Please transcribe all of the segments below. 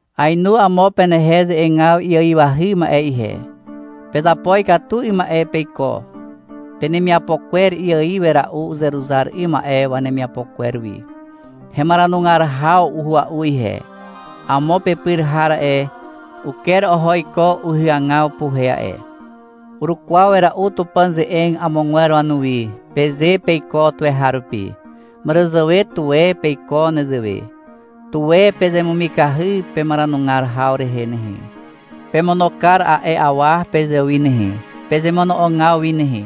Aenu amo penehe ze'egaw iaiwahy ma'e ihe. Pezapo ikatu 'ym ma'e peiko. Penemiapo kwer iaiw wera'u uzeruzar 'ym ma'e wanemiapo kwer wi. Hemaranugar haw uhua'u ihe. Amo pepyr har a'e, uker oho iko uhyagaw puhe a'e. — Urukwaw wera'u Tupàn ze'eg amogwer wanuwi, peze peiko tuweharupi. Màràzàwe tuwe peiko nezewe. Tuwe pezemumikahy pemaranugar haw rehe nehe. Pemono kar a'e awa pezewi nehe, pezemono'ogaw wi nehe.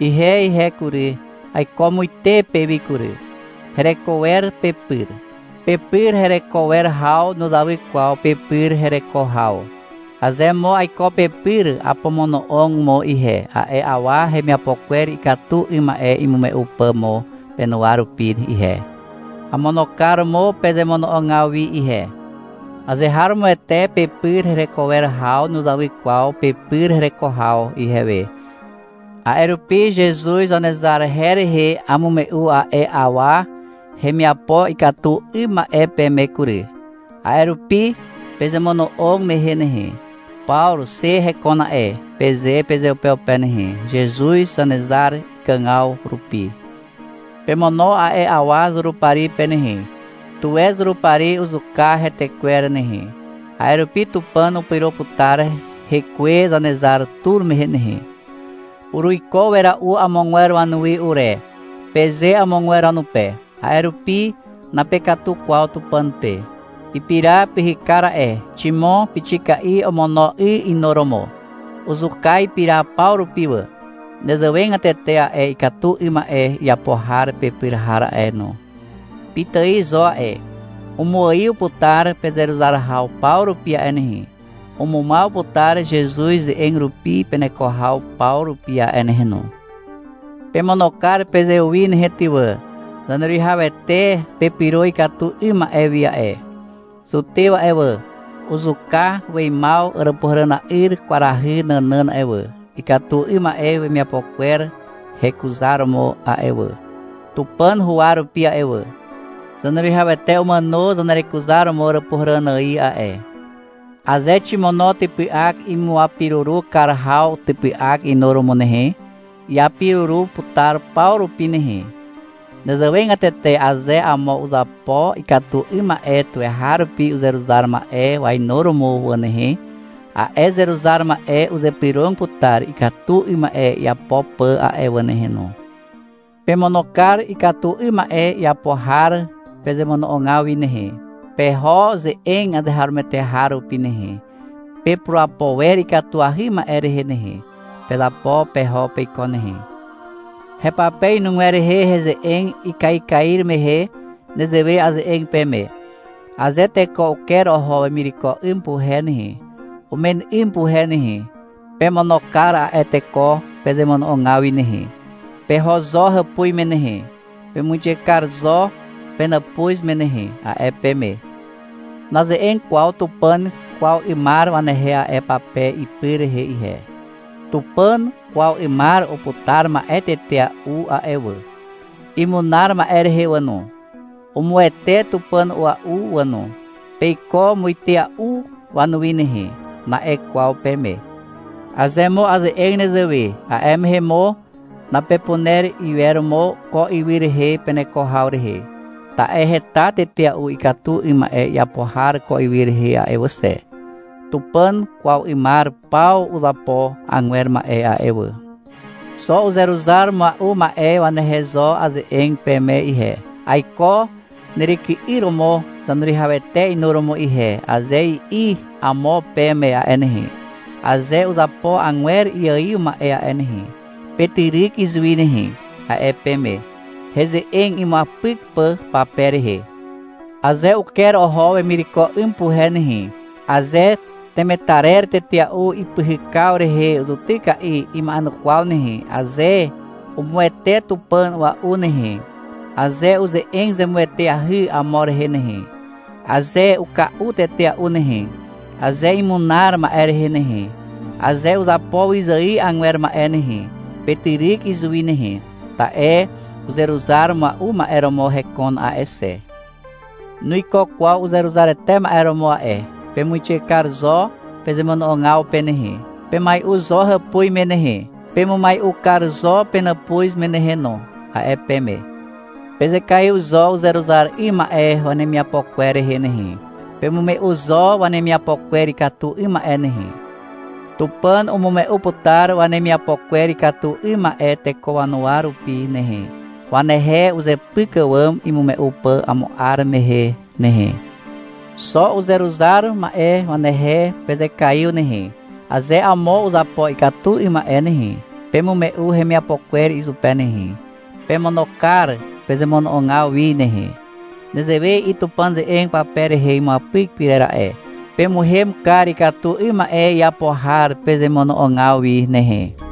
Ihe ihe kury, aiko muite pewi kury. Hereko wer pepyr. Pepyr hereko wer haw nuzawy kwaw pepyr hereko haw. Aze mo aiko pepyr, apomono'og mo ihe, a'e awa hemiapo kwer ikatu 'ym ma'e imume'u pà mo penuwa rupi ihe. Amono kar mo pezemono'ogaw wi ihe. Azeharomoete pepyr hereko wer haw nuzawy kwaw pepyr hereko haw ihewe, a'e rupi Zezuz Zanezar her rehe amume'u a'e awa hemiapo ikatu 'ym ma'e peme kury. A'e rupi pezemono'og mehe nehe, — Pawru xe hekon a'e, peze pezeupeupe nehe. Zezuz Zanezar ikàgaw rupi pemono a'e awa Zurupari pe nehe. Tuwe Zurupari uzuka hetekwer nehe. A'e rupi Tupàn upyro putar hekwe Zanezar tur mehe nehe. — Uruiko wera'u amogwer wanuwi ure, peze amogwer wanupe. A'e rupi napekatu kwaw Tupàn pe. Ipira pyhykar a'e, ximo pixika'i omono 'y inuromo. Uzuka ipira paw rupi wà. Nezewegatete a'e ikatu 'ym ma'e iapo har pepyr har a'e no, pitài zo a'e, umuaiw putar pezeruzar haw paw rupi a'e nehe. Umumaw putar Zezuz ze'eg rupi peneko haw paw rupi a'e nehe no. Pemono kar pezewi nehe ty wà. Zaneruwihawete pepyro ikatu 'ym ma'e wi a'e. Zutew a'e wà, uzuka weimaw àràpuhàràna'yr kwarahy nànàn a'e wà, ikatu 'ym ma'e wemiapo kwer hekuzaromo a'e wà, Tupàn huwa rupi a'e wà. Zaneruwihawete umàno zanerekuzaromo Àràpuhàràn ài a'e. Aze ximono typy'ak imuapiruru kar haw typy'ak inuromo nehe, iapiruru putar paw rupi nehe. Nezewegatete aze amo uzapo ikatu 'ym ma'e tuweharupi uzeruzar ma'e wainuromo wà nehe, a'e uzeruzar ma'e uzypyrog putar ikatu 'ym ma'e iapo pà a'e wà nehe no. Pemono kar ikatu 'ym ma'e iapo har pezemono'ogaw wi nehe. Peho ze'eg azeharomoete har rupi nehe. Pepurapo wer ikatuahy ma'e rehe nehe. Pezapo peho peiko nehe. Hepape inugwer rehe heze'eg ikaikair mehe nezewe aze'eg peme. — Aze teko uker oho wemireko 'ym puhe nehe, umen 'ym puhe nehe, pemono kar a'e teko pezemono'ogaw wi nehe. Peho zo hàpuz me nehe. Pemuixe kar zo penàpuz me nehe, a'e peme. Naze'eg kwaw Tupàn kwaw 'ymar wanehe a'e pape ipy rehe ihe. Tupàn kwaw 'ymar uputar ma'e tetea'u a'e wà. Imunar ma'e rehe wà no. Umuwete Tupàn a'ua'u wà no. — Peiko muitea'u wanuwi nehe, na'e kwaw peme. Aze mo aze'eg nezewe, a'e mehe mo napepuner iwer mo ko ywy rehe peneko haw rehe. Ta'e heta tetea'u ikatu 'ym ma'e iapo har ko ywy rehe a'e wà xe. Tupàn kwaw 'ymar paw uzapo agwer ma'e a'e wà. Xo uzeruzar mua'u ma'e wanehe zo aze'eg peme ihe. — Aiko neryky'yr romo Zaneruwihawete inuromo ihe, aze i'i amo peme a'e nehe, aze uzapo agwer iaiw ma'e a'e nehe, petyryk izuwi nehe, a'e peme, heze'eg imuapyk pà pape rehe. — Aze uker oho wemireko 'ym puhe nehe, aze temetarer tetea'u ipyhykaw rehe zutyka'i ima'enukwaw nehe, aze umuwete Tupàn a'ua'u nehe, aze uze'eg zemueteahy amo rehe nehe, aze uka'u tetea'u nehe, aze imunar ma'e rehe nehe, aze uzapo wyzài agwer ma'e nehe, petyryk izuwi nehe, ta'e uzeruzar mua'u ma'e romo hekon a'e xe. Nuiko kwaw uzeruzarete ma'e romo a'e. Pemuixe kar zo pezemono'ogaw pe nehe. Pemai'u zo hàpuz me nehe. Pemumai'u kar zo penàpuz me nehe no, a'e peme. Pezekaiw zo uzeruzar 'ym ma'e wanemiapo kwer rehe nehe. Pemume'u zo wanemiapo kwer ikatu 'ym ma'e nehe. Tupàn umume'u putar wanemiapo kwer ikatu 'ym ma'e teko wanuwa rupi nehe, wanehe uzepyk àwàm imume'u pà amo 'ar mehe nehe. Xo uzeruzar ma'e wanehe pezekaiw nehe. Aze amo uzapo ikatu 'ym ma'e nehe, pemume'u hemiapo kwer izupe nehe. Pemono kar pezemono'ogaw wi nehe. Nezewe i'i Tupàn ze'eg pape rehe imuapyk pyrer a'e. — Pemuhem kar ikatu 'ym ma'e iapo har pezemono'ogaw wi nehe.